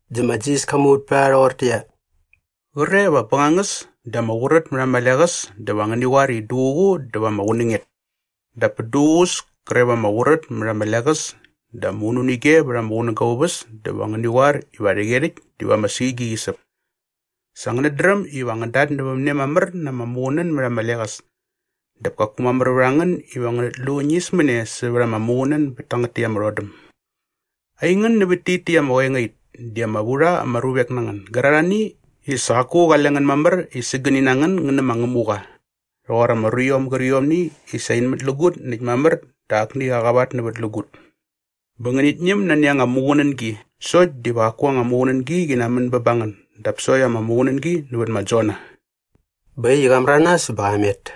Dä ma Jisas ka muvät pät a rha rhoqortäqyia, “Qre va bängangäs dä ama qurät mät ama leqäs dä va ngäni qoar i duququ dä va ama qunänget. Dap pät duququs kre va ama qurät mät ama leqäs dä ama ununige vät ama qunäga aa uväs dä va ngäni qoar iva rhäqyerhäkt diva ama suigi qi säp. Sa ngänät dräm iva ngän datnävämne mamär na ama muqunän mät ama leqäs dap kaku mamär vät a ngän iva ngänät lu ñismäne sävät ama muqunän bät tangät täkt ama rhodäm. Aingän nävät tit täkt ama qoengait di ama vu rha ama ruvek na ngän gärarhani i sa qaku qale ngän mamär i sägäni na ngän ngän nä ma Ngämuqa rhoqor ama ruiom gärqiomni i sa in mätlägut näkt mamär dä akni qa qavatnävätlägut. Bä ngänit ñäm nani anga muqunängi sokt diva qaku anga muqunängi qi namän bä ba ngän dap sokt ama muqunängi nävät ma Jona.” Bä äkt i qa märanas bä qa met.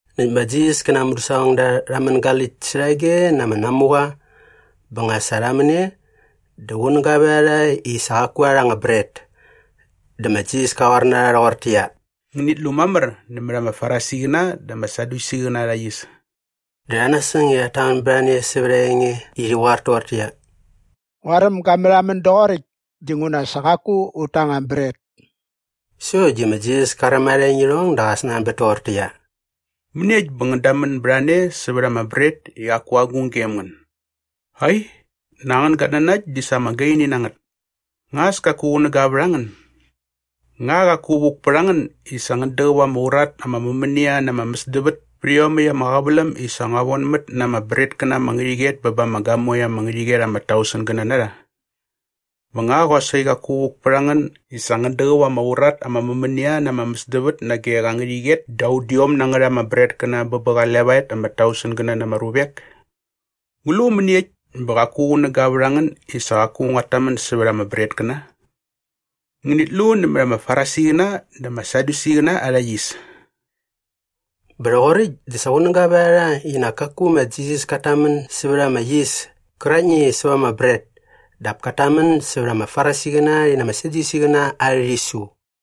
Näkt ma Jisas kä na aa mudäsaqongda rha mängaläkt särhage na ama namuqa bä nga sa rha män e dä qunäga vät a rha i sa qaku rha rha anga bret. Dä ma Jisas ka qoar na rha rhoqortäqyia, “Ngänit lu mamär nämät ama Farisiqäna dä ama Sadyusiqäna arha yis.” Dä rha nasäng i rhat tamän bät a ne sävät aa enge i rhi qoar toqortäqyia, “Nguaräm ga märhamän doqoräkt dinguna sa qaku ut ta anga bret.” Sokt di ma Jisas ka räm arha engirhong dä qa snanbät toqortäqyia, “Mäniekt bä ngän damän bät a ne sa ama bret i qaku agung gem ngän? Ai, nak angän gatnanakt di sa ama gaini na ngät. Nga as kaku qunäga vät a ngän? Nga qaku vuk pät a ngän i sa ngän däqäp ama urat ama mämänia na ama mäsdävät pät iomäkt ama qäväläm i sa ngua vonmät na ama bretkäna ama ngärhäqyet bä ba ama gamoe ama ngärhäqyet ama tausengäna na rha? Bä nga qosaqi qaku vuk pät a ngän i sa ngän däqäp ama urat ama mämänia na ama mäsdävät nage qa ngärhäqyet da udiom na ngät ama bretkäna bä bä qa levaet ama tausengäna na ama ruvek? Ngu lu mäniekt bä qaku qunäga vät a ngän i sa qaku nguat tamän sävät ama bretkäna? Ngänit lu nämät ama Farisiqäna dä ama Sadyusiqäna arha yis.” Bä rhoqoräkt dä sa qunäga vät a rha i nak kaku ma Jisas kat tamän sävät ama yis käraktni i säva ama bret dap kat tamän sävät ama Farisiqäna rhi na ama Sadyusiqäna arhä rhisu.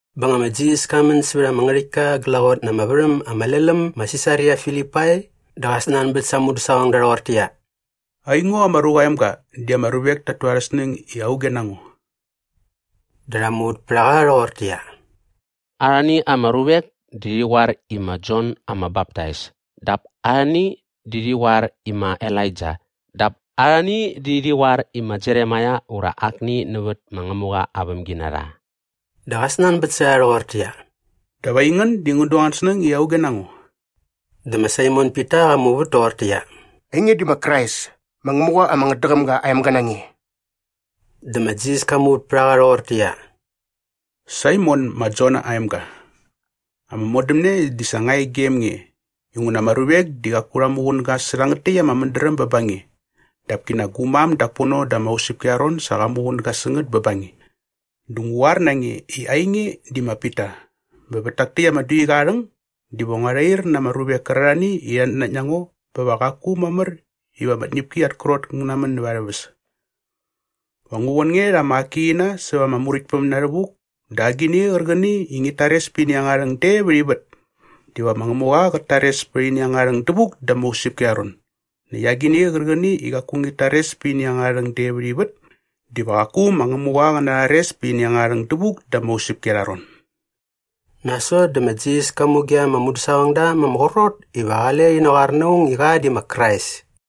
Bä nga ma Jisas ka män sävät ama ngärhäktka glaqot na ama värhäm ama lel äm ma Sisaria Filipai dä qa snanbät sa aa mudäsaqongda rhoqortäqyia, “Aingo ma Ruqa aa Emga di ama ruvek tat tu arhä snäng i auge na ngo?” Dä rha muvät pät a qa rhoqortäqyia, “Arhani ama ruvek di rhi qoar i ma Jon ama Baptais dap arhani di rhi qoar i ma Elaija dap arhani di rhi qoar i ma Jeremaia ura akni nävät ma Ngämuqa aa vämginarha.” Dä qa snanbät sä rha rhoqortäqyia, “Dap aingän di ngän du angän snäng i auge na ngo?” Dä ma Saimon Pita qa muvät toqortäqyia, “Ainge di ma Krais ma Ngämuqa ama ngätdäqäm ga aa emga na nge.” Dä ma Jisas ka muvät pät a qa rhoqortäqyia, “Saimon ma Jona aa emga, ama modämne di sa nga e gem nge inguna ama ruvek di qaku rha muqunäga sä rhangät täkt ama mädräm bä ba nge dap kinak gu mam dak pono da ama usäpki arha ron sa qa muqunäga sä ngät bä ba nge. Dä ngu qoar na nge i ainge di ma Pita bä vät tak täkt ama duiqa aa rhäng diva ngua rhair na ama ruvek kärarhani i rhat nanakt na ngo bä va qaku mamär iva ama tñäpki at krot ngä namän näva arhä väs. Va ngu von nge rha ama akiqina säva ama Muräktpäm na rhävuk dä agini qärqäni i ngit tares pät ini angärha rhäng de vät ivät diva ma Ngämuqa qät tares pät ini angärha rhäng dävuk da ama usäpki arha ron näkt agini qärqäni i qaku ngit tares pät ini angärha rhäng de vät ivät diva qaku ma Ngämuqa qä narhares pät ini angärha rhäng dävuk da ama usäpki arha ron.” Nasot dä ma Jisas ka muge ama mudäsaqongda ma ama qrot iva qale rhi naqoar na aung i qa di ma Krais.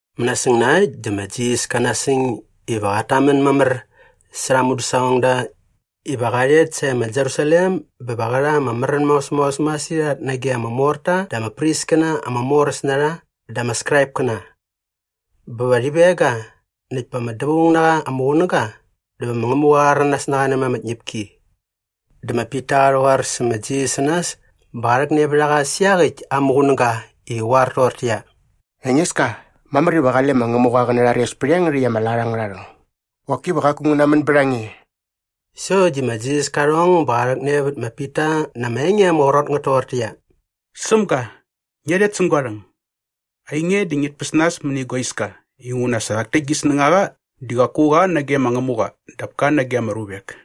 Mänasäng na äkt dä ma Jisas ka nasäng iva qat tamän mamär särha aa mudäsaqongda iva qa rhet sae ma Jerusalem bä va qä rha ama märän maos maos masirhat nage ama morta dä ama priskäna ama moräs na rha dä ama Skraipkäna. Bä va rhi veng ga näkt pät ama dävaung na qa ama qunäga dä va ma Ngämuqa qa rhäranas na qa nämät ama tñäpki. Dä ma Pita qa rhäqoar sä ma Jisas sä nas bä qa rhäkne vät a qa sä iaqäkt aa muqunäga i qä qoar toqortäqyia, “Engeska, mamär iva qale ma Ngämuqa qä narhares pät iangärhäkt ama lat angärha rhäng. Qoki va qaku ngä namän bät a nge.” Sokt di ma Jisas ka rhong bä qa rhäkne vät ma Pita na ama enge ama qrot ngät toqortäqyia, “Sämga, ngia rhet säng gua rhäng. Ainge di ngit päs nas mäni gua iska inguna sa rhak täkt gi snängaqa di qaku qa nage ma Ngämuqa dap ka nage ama ruvek.”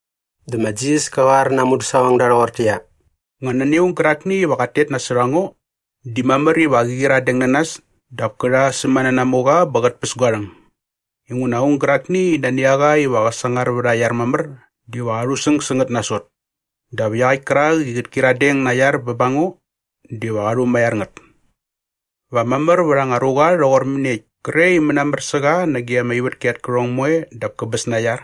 Dä ma Jisas ka qoar na aa mudäsaqongda rhoqortäqyia, “Nga nani aung gärakni iva qat tet nasot a ngo di mamär iva qä qyiradeng na nas dap kä rha aa sämänanamuqa bä qät päs gua rhäng. Inguna aung gärakni i nani a qa iva qä sangar vät aa iar mamär diva qa rhusäng sä ngät nasot. Dap iaqäkt kärak i qät kyiradeng na aa iar bä ba ngo diva qa rhumaiar ngät. Va mamär vät anga ruqa rhoqor mäniekt kre i mänamär sä qa nage ama ivätki at kärhong moe dap käbäs na aa iar?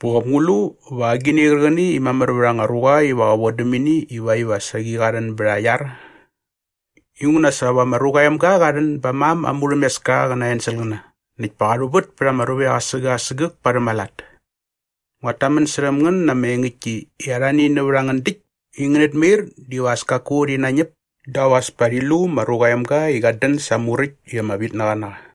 Bä qop ngu lu va agini qärqäni i mamär vät anga ruqa iva qä vodäm ini ivakt iva saqi qa rhän bät aa iar? “Inguna sa va ma Ruqa aa Emga qa rhän ba aa mam aa murhämeska qä na aa enselqäna näkt pa qa rhuvät pät ama ruvek asägäk asägäk parhäm aa lat. Nguat tamän särhäm ngän na ama engäktki i arhani nävät a ngän däkt i ngänät mair diva as kaku rhi nañäp dap as pa rhi lu ma Ruqa aa Emga i qat dän sa aa muräkt i ama vitnaqa na qa.”